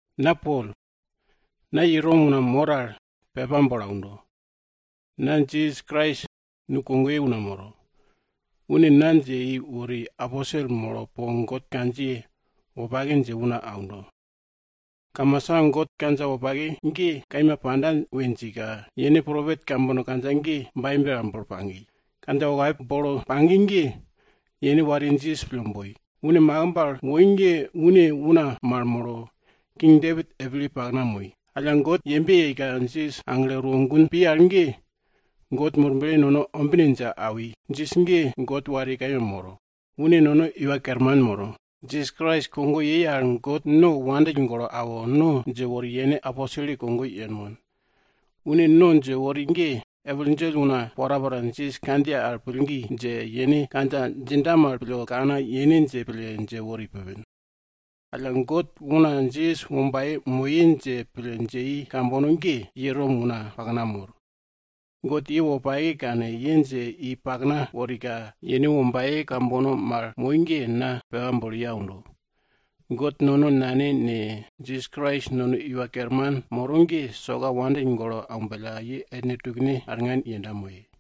Na Pol, na ye Rom una mor al pepa bolo aundo. Na Jisas Krais nu kogoye una moro. Une na dje i wori, aposelye molo po God kandjiye wopake dje una aundo. Kamasa God kandja wopake ge kaima panda we djika, yene propet kambono kandja ge Baibel al bolo pagi. Kandja wopake bolo pagi ge yene wariye Jisas pille boi. Une makimb al woi ge une una mal molo, King Depit epilye pakna moi. Alla God yembe yeika, Jisas aglo erwo gun pi al ge, God Murble nono ombine dje awi, Jisas ge God wariye kaima moro. Une nono Iwa Kerman moro. Jisas Krais kogo yei al God no wopake pille awo, no dje wori yene aposel kogo yenmon. Une no dje wori ge, epil djell una porapora Jisas kandjiye al pillgi dje, yene kandja djinda mal pille kane yene dje pille dje wori pupin. Alla God una Jisas wombaye moye dje pille dje i kambono ge, ye Rom una pakna mor. God ye wopake kane, ye dje i pakna worika, yene wombaye kambono mal moi ge, na pepa bolo ye aundo. God nono Nane ne, Jisas Krais nono Iwa Kerman moro ge, soka ye wopake pille aumbellka ye ellne tukne arngan yenda moye.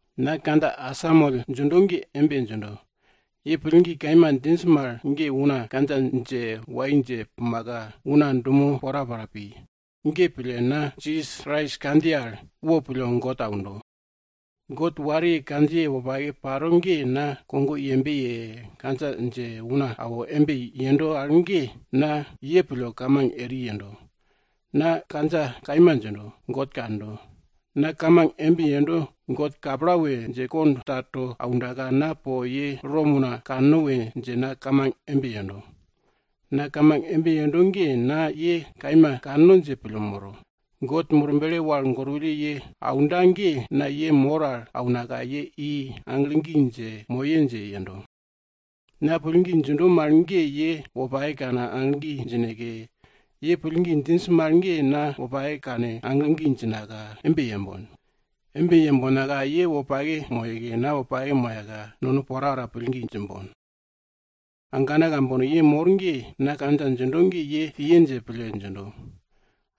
Na kandja asamoll djindo ge embe djindo, ye pillgi kaima djinj mal ge una kandja dje wai dje pumaka una dumo porapora pi. Ge pille, na Jisas Krais kandjiye al, wopille God aundo. God wariye kandjiye wopake paro ge na kogo yembe ye, kandja dje una awo embe yendo al ge, na ye pille kamang eri yendo. Na kandja kaima djindo, God kando. Na kamang embe yendo, God kapla we dje kond ta, to aundaka, na po ye Rom una kanno we dje na kamang embe yendo. Na kamang embe yendo ge na ye kaima kanno dje pille moro. God Murble wal gorwulle ye aunda ge, na ye mor al aunaka, ye i, aglo gi dje moye dje yendo. Na pillgi djindo mal ge ye wopake kane aglo gi djineke, ye pillgi djinj mal ge na wopake kane aglo gi djinaka, embe yembon. Embe yembonka, ye wopake moyeke na wopake moyaka nono porapora pillgi djimbon. Agana ambana kambono, na kandja djindo ge ye piye dje pille djindo.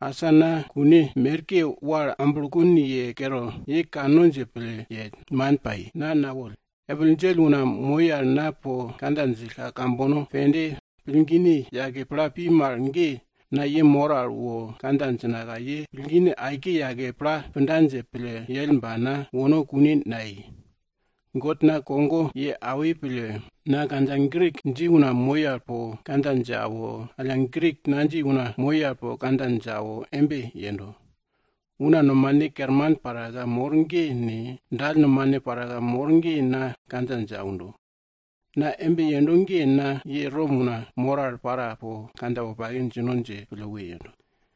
Asa na kun merke wal amblokun ye kere, ye kanno dje pille yell, man pai, na nawoll. Epil djell una moi al na po kandja djillka kambono pende pillgine yake pla pi mal ge, na ye mor al wo kandja djinaka ye pillgine aike yake pla punda dje pille yell ba na wono kune nayei. God na kogo ye awi pille, na kandja Grik dji una moi al po kandja dje awo, alla Grik nadji una moi al po kandja dje awo embe yendo. Una nomane kerman paraka mor ge ne, dall nomane paraka mor ge na kandja dje aundo. Na embe yendo ge na ye Rom una mor al para po kandja wopake djino dje pille we yendo.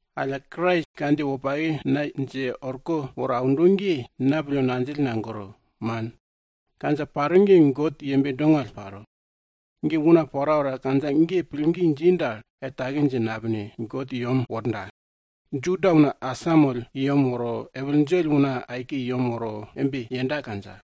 Alla Krais kandjiye wopake na dje orko woro aundo ge, na pille ngandjill nagoro, man. Kandja paro ge God yembe dongall paro. Una porapora kandja ge pillgi dji dal, er take dje napine, God i yem worda. Juda una asamoll i yem woro, epil djell una aike i yem woro embe yenda kandja.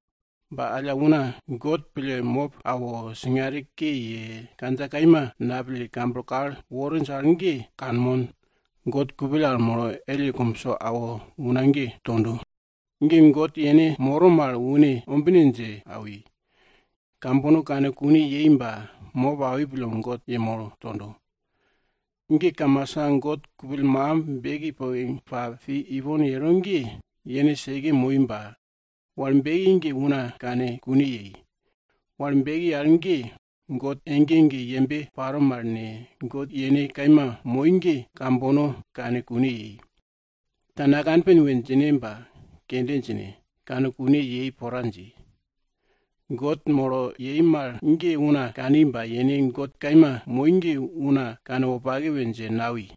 Ba alla una God pille mop awo, singare ke ye, kandja kaima napille kamblo kal worinj al ge kanmon, God kupill al molo elle kumbso awo una ge tondo. Ge God yene moro mal une ombine dje awi, kambono kane kune yei ba mop awi pille God yemolo tondo. Ge kamasa God kupill makimb beki poke pa pi ipon yero ge, yene seke moi ba wal beki ge una kane kune yei. Wal beki al ge, God ege ege yembe paro mal ne, God yene kaima moi ge, kambono kane kune yei. Ta nakanpin we djine ba kende djine, kane kune yei pora dji. God molo wal beke yei mal ge una kani ba yene God kaima moi ge una kanwopake we dje nawi,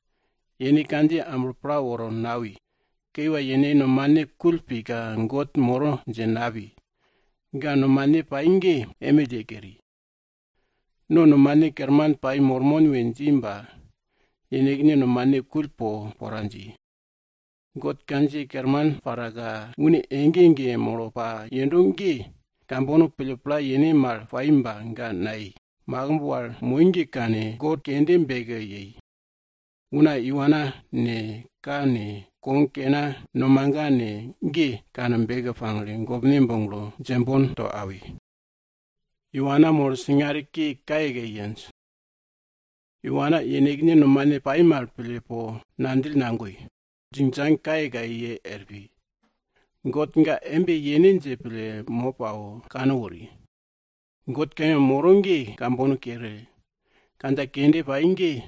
yene kandjiye amblo pla woro nawi. Kiwa, yenekne nomane kull pika God moro dje napi, ga nomane pai ge emill ye keri. No nomane kerman pai mormon we dji ba, yenekne nomane kull po pora dji. God kandjiye kerman paraka une ege ege molo pa yendo ge kambono pille pla yene mal pai ba ga nayei. Makimb wal moi ge kane, god kende beke yei. Una iwana ne, ka ne, kog kena ne, nomaga ne, ge kane beke pagle, gopne boglo djembon to awi. Ge pille, God ga keri. Yenekne nomane pai mal pille po ngandjill nagoi, djingdjang ke kayekaye ye er pi. God ga embe yene dje pille, mop awo, kankeri. God kaima moro ge kambono kere, kandja kende pai ge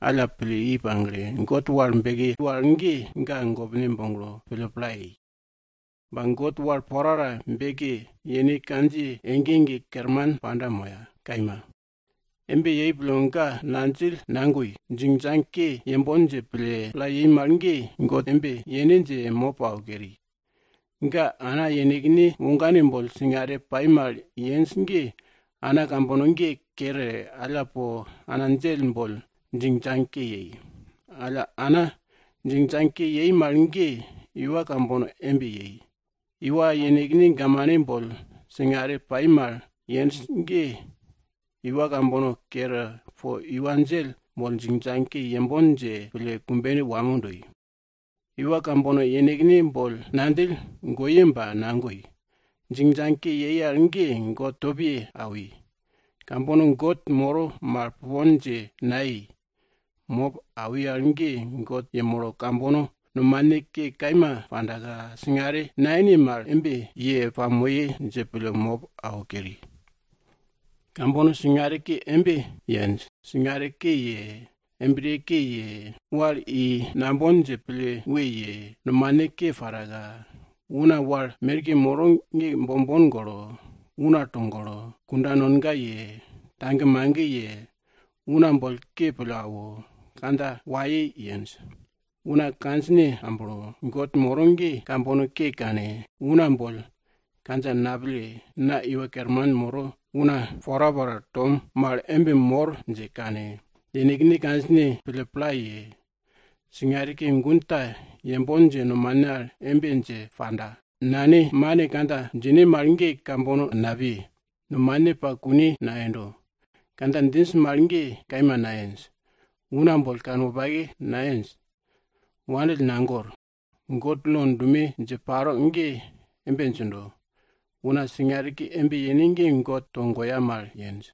alla pille i pagle, God wal beki wal ge, ga gopne boglo, pille pla yei. Ba God wal porapora beke, yene kandjiye ege ege kerman panda moya. Kaima. Embe yei pille, ga ngandjill nagoi, djingdjang ke yembon dje pille pla yei mal ge, God embe yene dje, mop awo keri. Ge ana yenekne wogane boll singare pai mal yenj ge ana kambono ge kere, alla po ana djell boll djingdjang ke yei. Alla ana djingdjang ke yei mal ge iwa kambono embe yei. Iwa yenekne gamane boll singare pai mal yenj ge iwa kambono kere, po iwa djell boll djingdjang ke yembon dje pille kumbene wamo doi. Iwa kambono yenekne boll ngandjill goye ba nagoi, djingdjang ke yei al ge God topne ke awi. Kambono God moro mal pupon dje nayei, mop awi al ge, God yemolo kambono nomane ke kaima pandaka, singare nayene mal, embe ye pamoye dje pille mop awo keri. Kambono singare ke embe yenj, singare ke ye, embriye ke ye, wal i nambon dje pille we ye, nomane ke paraka, una wal merke moro ge bombon golo, una togolo, kunda nonga ye, tagemage ye, una boll ke pille awo, kandja waye yenj. Una kandjine amblo, God moro ge kambono ke kane, una boll kandja napille, na iwa kerman moro, una porapora tom mal embe mor dje kane, yenekne kandjine pille pla ye, singare ke gun ta yembon dje nomane al embe dje panda, nanemane kandja djine mal ge kambono napiye. Nomane pa kune nayendo, kandja djinj mal ge kaima nayenj. Una boll kanwopake nayenj, wandill nagor. God lo dume dje paro ge embe djindo, una singare ke embe yene ge God togoya mal yenj.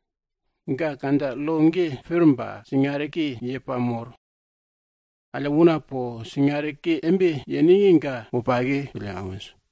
Ga kandja lo ge pir ba singare ke ye pamor. Alla una po singare ke embe yene ge, ga wopake pille awinj.